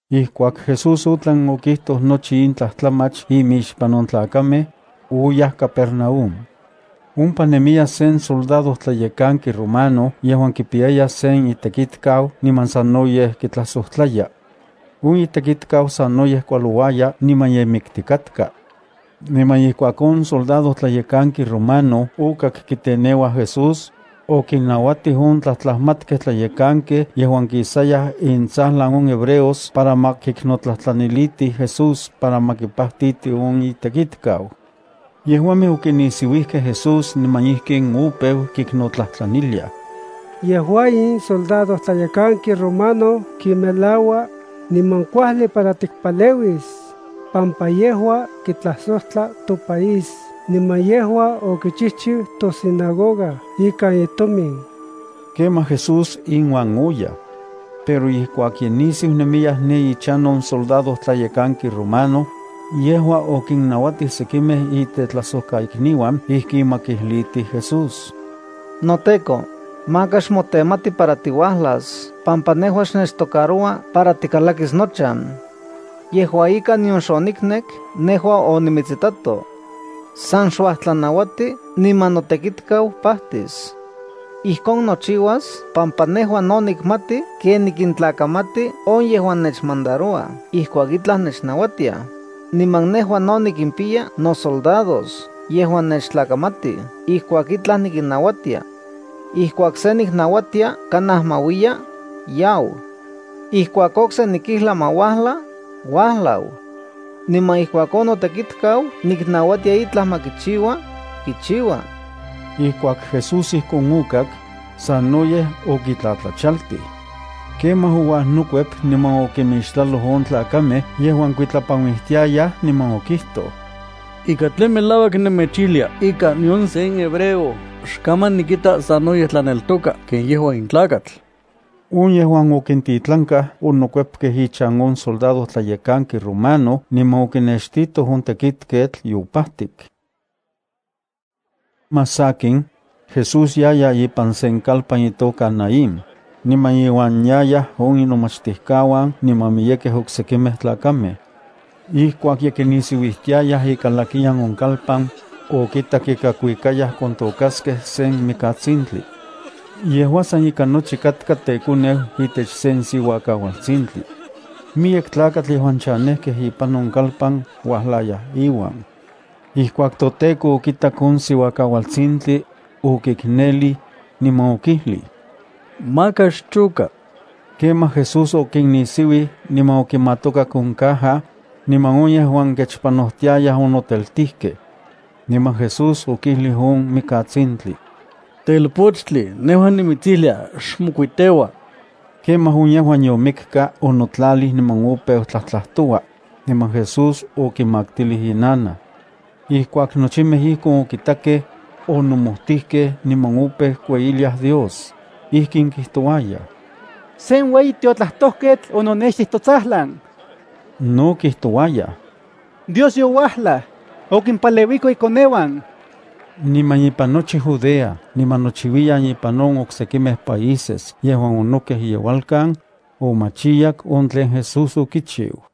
Ijkuak Jesús otlan okijtoj nochi in tlajtlamach imixpan on tlakamej, oyaj Capernaúm. Ompa nemiya sen soldadojtlayekanki romano yejuan kipiyaya sen itekitkau niman sanoyej kitlajsojtlaya. On itekitau sanoyej kualouaya niman ye miktikatka. Niman ijkuak on soldadojtlayekanki romano okak kiteneuaj Jesús, okinnauatij on tlajtlajmatkej tlayekankej yejuan kisayaj intsajlan on hebreos para ma kiknotlajtlanilitij Jesús para ma kipajtiti on itekitkau. Yejuamej okinisiuijkej Jesús niman ijkin opeu kiknotlajtlaniliaj: —Yejua in soldadojtlayekanki romano kimelaua, niman kuajli para tikpaleuis, pampa yejua kitlajsojtla topaís niman yejua okichijchiu tosinagoga ikan itomin. Kemaj Jesús inuan oyaj. Pero ijkuak ye nisiu nemiyaj ne ichan on soldadojtlayekanki romano, yejua okinnauatij sekimej itetlajsojkaikniuan ijkin ma kijlitij Jesús: —NoTEKO, maka xmotemati para tiuajlas pampa nejua xnechtocaroua para tikalakis nochan. Yejua ika, nion xoniknek nejua onimitsitsato. San xuajtlanauati niman notekitkau pajtis. Ijkon nochiuas pampa nejua no nikmati ken nikintlakamati on yejuan nechmandarouaj ijkuak itlaj nechnauatiaj, niman nejua no nikimpiya nosoldados yejuan nechtlakamatij ijkuak itlaj nikinnauatia. Ijkuak se niknauatia kanaj ma uiya, yau. Ijkuak okse nikijlis ma uajla, uajlau. Niman ijkuak on notekitkau niknauatia itlaj ma kichiua, kichiua. Ijkuak Jesús ijkon okak, sanoyej okitlatlachaltij. Kemaj ouajnokuep niman okimixtlaloj on tlakamej yejuan kikuitlapanuijtiayaj niman okijtoj: —Ika tlen melauak nemechijlia ika nion sen hebreo xkaman nikita sanoyej tlaneltoka ken yejua in tlakatl. On yejuan okintitlankaj onokuepkej ichan on soldadojtlayekanki romano niman okinextitoj on tekitketl yopajtik. Achijtsin más sakin, Jesús yaya ipan sen kalpan itoka Naín, niman iuan yayaj on inomachtijkauan niman miyekej oksekimej tlakamej. Ijkuak ye kinisiuijtiayaj ikalakiyan on kalpan, okitak ika kuikayaj kontokaskej sen mikatsintli. Yejua san ika nochi katka tekoneu itech sen siuakaualtsintli. Miyek tlakatl yejuan chanejkej ipan on kalpan uajlayaj iuan. Ijkuak toTEKO okitak on siuakaualtsintli, okiknelij, niman okijlij: —Maka xchoka. Kemaj Jesús okinnisiuij niman okimatokak on caja, niman on yejuan kechpanojtiayaj onoteltijkej. Niman Jesús okijlij on mikatsintli: —Telpochtli, nejua nimitsijlia: ¡Xmokuiteua! Kemaj on yejuan yomikka onotlalij niman opeu tlajtlajtoua, niman Jesús okimaktilij inanaj. Ijkuak nochimej ijkon okitakej, onomojtijkej niman opeu kueyiliaj Dios. Ijkin kijtouayaj: —Sen ueyi tiotlajtojketl ononextij totsajlan. No kijtouayaj: —Dios youajlaj, okimpaleuiko ikoneuan. Niman ipan nochi Judea niman nochiuiyan ipan on oksekimej países yejuan onokej iyeualkan, omachiyak on tlen Jesús okichiu.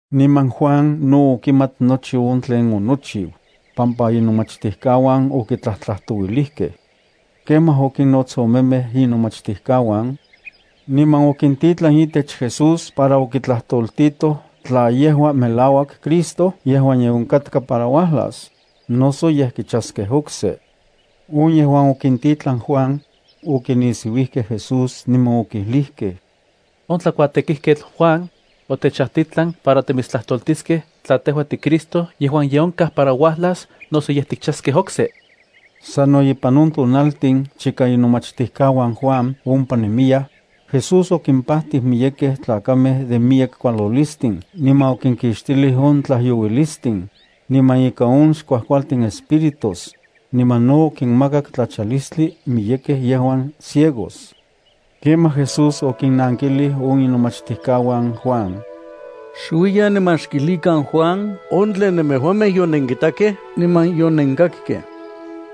Niman Juan no okimat nochi on tlen onochiu, pampa inomachtijkauan okitlajtlajtouilijkej. Kemaj okinnots omemej inomachtijkauan, niman okintitlan itech Jesús para okitlajtoltitoj tla yejua melauak Cristo yejuan ye onkatka para uajlas, noso yej kichaskej okse. On yejuan okintitlan Juan, okinisiuijkej Jesús niman okijlijkej: —On tlakuatekijketl Juan, otechajtitlan para timitstlajtoltiskej tla tejua tiCristo yejuan ye onkaj para uajlas noso yej tikchaskej okse. Sano ipan on tonaltin chika inomachtijkauan Juan ompa nemiyaj, Jesús okimpajtij miyekej tlakamej de miyek kualolistin niman okinkixtilij on tlajyouilistin, niman ika on xkuajkualtin espíritus, niman no okinmakak tlachalistli miyekej yejuan ciegos. Kemaj Jesús okinnankilij on inomachtijkauan Juan: —Xuiyan niman xkijlikan Juan on tlen nemejuamej yonenkitakej niman yonenkakkej.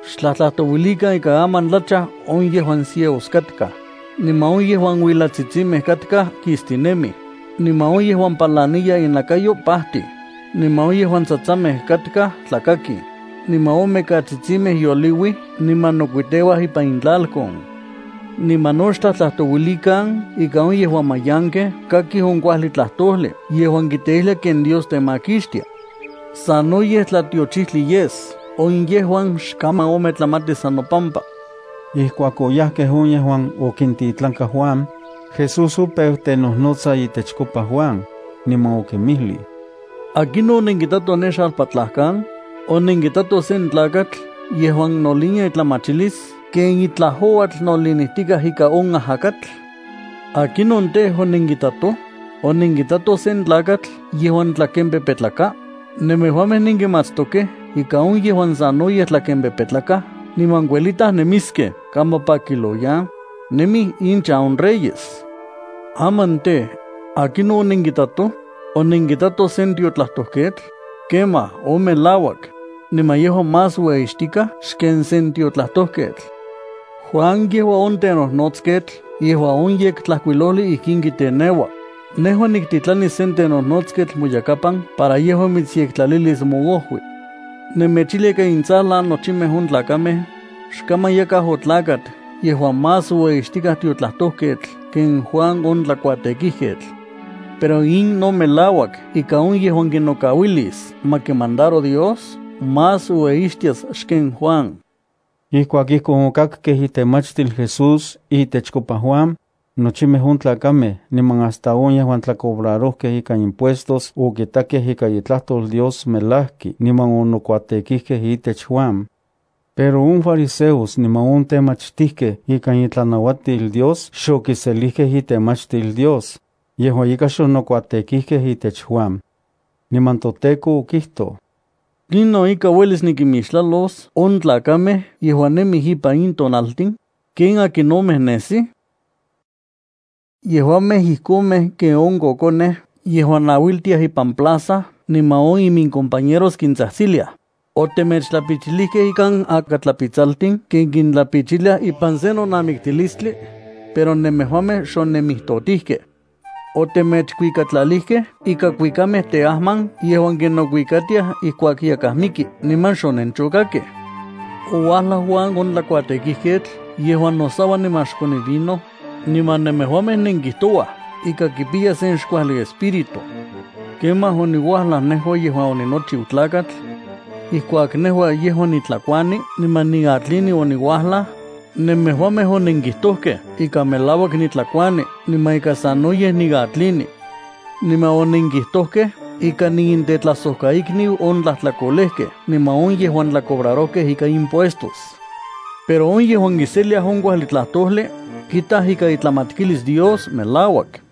Xtlajtlajtouilikan ika aman tlachaj on yejuan ciegos katkaj, niman on yejuan uilatsitsimej katkaj kistinemij, niman on yejuan palaniya innakayo pajtij, niman on yejuan tsatsamej katkaj tlakakij, niman on mikatsitsimej yoliuij niman nokuiteuaj ipan intlalkon. Niman no xtlajtlajtouilikan ika on yejuan mayankej kakij on kuajli tlajtojli yejuan kiteijlia ken Dios temakixtia. Sanoyej tlatiochijtli yes on yejuan xkaman ometlamatis san nopampa. Ijkuak oyajkej on yejuan okintitlanka Juan, Jesús opeu tenojnotsa itechkopa Juan, niman okinmijlij: —¿Akinon onenkitatoj ne xalpatlajkan? ¿Onenkitatoj sen tlakatl yejuan nolinia itlamachilis ken itlaj ouatl nolinijtikaj ika on ajakatl? ¿Akinon tej, onenkitatoj? ¿Onenkitatoj sen tlakatl yejuan tlakempepetlaka? Nemejuamej nenkimatstokej ika on yejuan sanoyej tlakempepetlakaj niman kuelitaj nemiskej kampa pakiloyan, nemij inchan on reyes. Aman tej, ¿akinon onenkitatoj? ¿Onenkitatoj sen tiotlajtojketl? Kemaj, on melauak, niman yejua más ueyixtikaj xken sen tiotlajtojketl. Juan yejua on tenojnotsketl yejuan on Yektlajkuilojli ijkin kijteneua: Nejua niktitlanis sen tenojnotsketl moyakapan para yejua mitsyektlalilis moojui. Nemechijlia ika intsajlan nochimej on tlakamej, xkaman yakaj otlakat yejuan más ueyixtikaj tiotlajtojketl ken Juan on tlakuatekijketl. Pero in no melauak ika on yejuan kinokauilis ma kimandaro Dios más ueyixtias xken Juan. Ijkuak ijkon okakkej itemachtil Jesús itechkopa Juan, nochimej on tlakamej niman hasta on yejuan tlacobrarojkej ika impuestos okitakej ika itlajtol Dios melajki niman onokuatekijkej itech Juan. Pero on fariseos niman on temachtijkej ikan itlanauatil Dios xokiselijkej itemachtil Dios, yejua ika xonokuatekijkej itech Juan. Niman toTEKO okijtoj: —¿Tlinon ika uelis nikimixtlalos on tlakamej yejuan nemij ipan in tonaltin? ¿Ken akinomej nesij? Yejuamej ijkomej ken on kokonej yejuan nauiltiaj ipan plaza niman on imincompañeros kintsajtsiliaj: “Otemechtlapichilijkej ikan akatlapitsaltin ken kintlapichiliaj ipan sen nonamiktilistli, pero nemejuamej xonemijtotijkej. Otemechkuikatlalijkej ikan kuikamej teajman yejuan kinokuikatiaj ijkuak yakaj miki niman xonenchokakkej.” Ouajlaj Juan on tlakuatekijketl yejuan nosaua niman xkoni vino, niman nemejuamej nenkijtouaj ika kipiya sen xkuajli espíritu. Kemaj oniuajlaj nejua yejuan oninochiu Tlakatl. Ijkuak nejua yejuan nitlakuani niman niatlini oniuajlaj, nemejuamej onenkijtojkej ika melauak nitlakuani niman ika sanoyej niatlini. Niman onenkijtojkej ika niintetlajsojkaikniu on tlajtlakolejkej niman on yejuan tlacobrarojkej ika impuestos. Pero on yejuan kiselia on kuajli tlajtojli, kitaj ika itlamatkilis Dios melauak.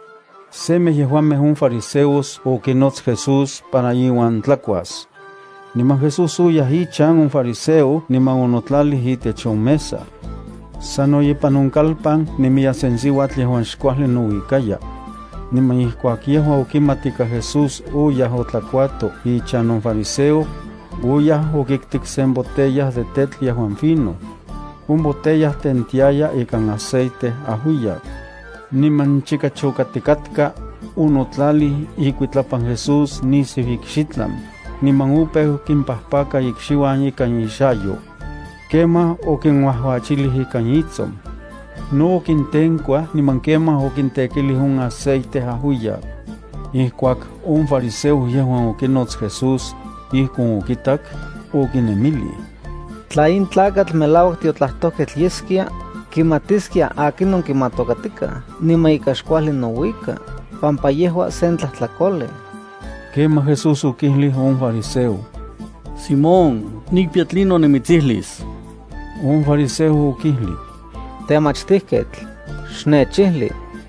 Semej yejuamej on fariseos okinots Jesús para iuan tlakuas. Niman Jesús oyaj ichan on fariseo niman onotlalij itech on mesa. Sano ipan on kalpan nemiya sen siuatl yejuan xkuajli nouikaya. Niman ijkuak yejua okimat ika Jesús oyaj otlakuato ichan on fariseo, oyaj okiktik sen botella de tetl yejuan fino. On botella tentiaya ikan aceite ajuiyak. Niman chika chokatikatka, onotlalij ikuitlapan Jesús nisiu ikxitlan, niman opeu kimpajpaka ikxiuan ikan ixayo. Kemaj okinuajuachilij ikan itson. No okintenkuaj niman kemaj okintekilij on aceite ajuiyak. Ijkuak on fariseo yejuan okinots Jesús, ijkon okitak, okinemilij: “Tla in tlakatl melauak tiotlajtojketl yeskia, kimatiskia akinon kimatokatikaj niman ika xkuajli nouika, pampa yejua sen tlajtlakolej.” Kemaj Jesús okijlij on fariseo: —Simón, nikpiya tlinon nimitsijlis. On fariseo okijlij: —Temachtijketl, xnechijli.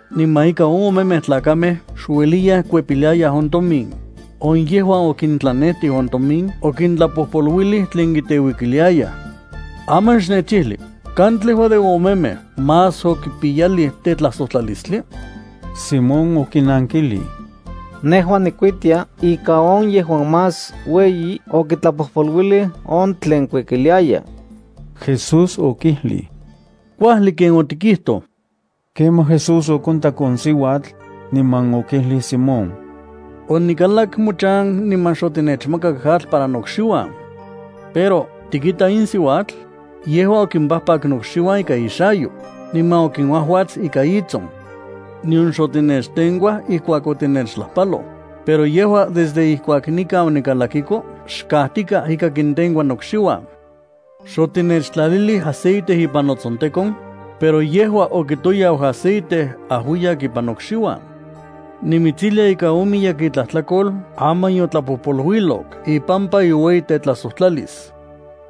Niman ika on omemej tlakamej xueliyaj kuepiliayaj on tomin, on yejuan okintlanejtij on tomin okintlapojpoluilij tlen kiteuikiliayaj. Aman xnechijli, ¿katlejua de on omemej más okipiyalij tetlajsojtlalistli? Simón okinankjlij: —Nejua nikuitia ika on yejuan más ueyi okitlapojpoluilij on tlen kuikiliaya. Jesús okijlij: —Kuajli ken otikijtoj. Kemaj Jesús okontak on siuatl, niman okijlij Simón: —Onikalak mochan niman xotinechmakak atl para nokxiuan. Pero, ¿tikita in siuatl? Yejua okinpajpak nokxiuan ikan ixayo, niman okinuajuats ikan itson. Nion xotinechtenkuaj ijkuak otinechtlajpaloj, pero yejua desde ijkuak nikan onikalakiko xkajtikaj ika kintenkua nokxiuan. Xotinechtlalilij aceite ipan notsontekon, pero yejua okitoyau aceite ajuiyak ipan nokxiuan. Nimitsijlia ika on miyek itlajtlakol aman yotlapojpoluilok ipampa iueyitetlajsojtlalis.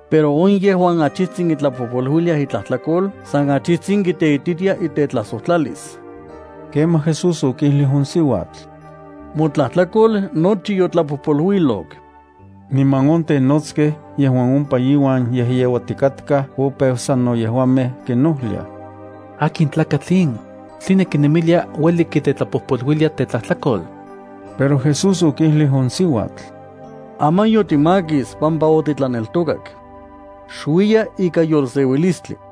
Pero on yejuan achijtsin kitlapojpoluiliaj itlajtlakol san achijtsin kiteititia itetlajsojtlalis. Kemaj Jesús okijlij on siuatl: —Motlajtlakol nochi yotlapojpoluilok. Niman on tenotskej yejuan ompa iuan yejyeuatikatkaj opeu sano yejuamej kinojliaj: —¿Akin tlakatl in? ¿Tline kinemilia ueli kitetlapojpoluilia tetlajtlakol? Pero Jesús okijlij on siuatl: —Aman yotimakis pampa otitlaneltokak. Xuiya ikan yolseuilistli.